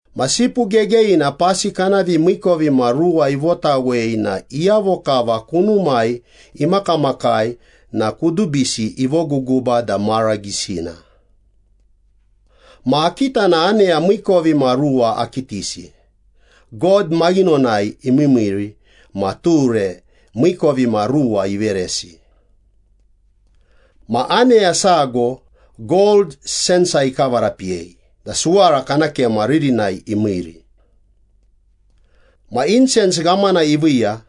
Ma Sipu Gegeyina pasi kana vimiikovimaruwa ivotawei na iyavo kava kunumai imakamakai na kudubisi ivoguguba da mara gisina. Ma akita na aneya miikovimaruwa akitisi, God maghinonai imiimiiri ma ture miikovimaruwa iveresi. Ma aneya sago gold sensa ikavarapiyei da suwara kana kema ririnai imiiri. Ma insens ghamana iviiya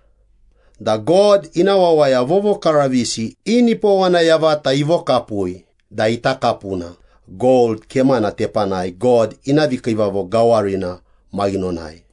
da God ina wawaya vovokaravisi i nipowana yavata ivokapui da ita kapuna gold kemana tepanai God ina vikiivavo gawarina maghinonai.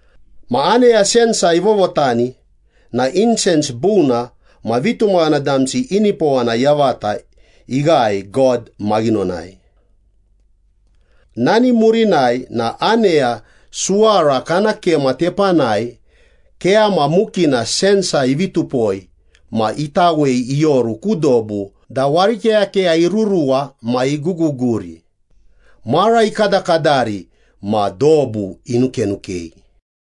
Ma aneya sensa ivovotani na insens buna ma vitumaghana damsi i nipowana yavata ighae God maghinonai. Nani murinai na aneya suwara kana kema tepanai keyama mukina sensa ivi tupoi ma itawei ioru ku dobu da warikeyakeya iruruwa ma iguguguri, mara ikadakadari ma dobu inukenukei.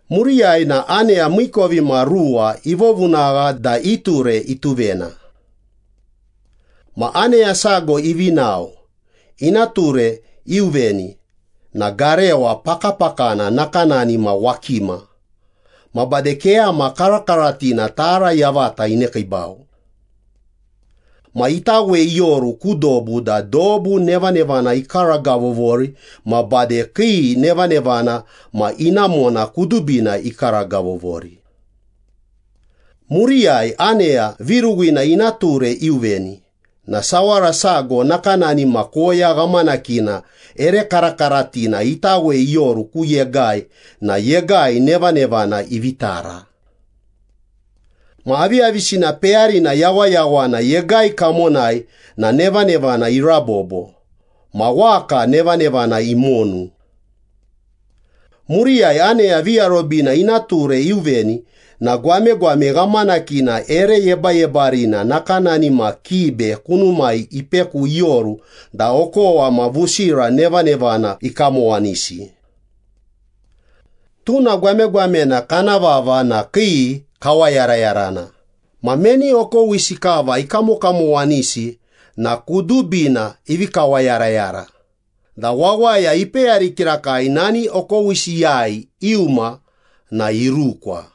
Muriyai na aneya miikovimaruwa ivovunagha da i ture ituvena. Ma aneya sago ivi nao, ina ture iuveni na garewa pakapakana nakanani ma wakima, ma bade keyama karakaratina tara yavata inekiibau. Ma itawei ioru ku dobu da dobu nevanevana ikaragavovori ma bade kii nevanevana ma inamona kudubina ikaragavovori. Muriyai aneya viruwina ina ture iuveni na sawara sago nakanani ma koya ghamanakina ere karakaratina itawei ioru ku yegai na yegai nevanevana ivi tara. Ma aviyavisina peyarina yawayawana yegai kamonai na nevanevana irabobo, ma waka nevanevana imonu. Muriyai aneya viarobina ina ture iuveni na gwamegwame ghamakina ere yebayebarina nakanani ma kibe kunumai ipeku ioru da okowa ma vusira nevanevana ikamowanisi. Tuna gwamegwamena kana vava na Kii Kawayarayarana ma meni okowisi kava ikamokamowanisi na kudubina ivi kawayarayara da wawaya ipeyari kirakai nani okowisiyai iuma na irukwa.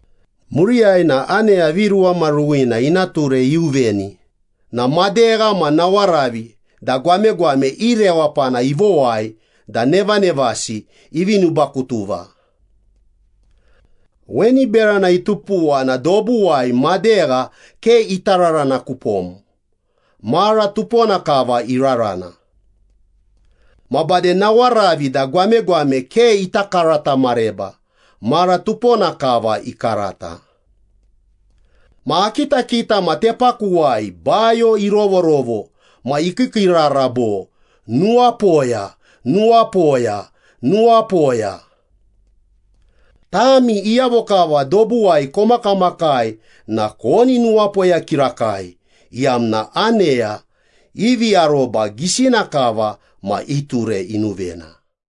Muriyai na aneya viruwamaruwina ina ture iuveni na madegha ma nawaravi da gwamegwame i rewapana ivowai da nevanevasi ivi nubakutuva. Weni berana itupuwa na dobuwai madegha ke ita rarana kupom, mara tupona kava irarana. Ma bade nawaravi da gwamegwame ke ita karata mareba, mara tupona kava ikarata. Ma akitakita ma tepakuwai bayo irovorovo ma ikiikiirara bo, “Nuwapoya, nuwapoya, nuwapoya. Tami iyavo kava dobuwai komakamakai na koni nuwapoya kirakai, iyamna aneya ivi aroba gisina kava ma i ture inuvena.”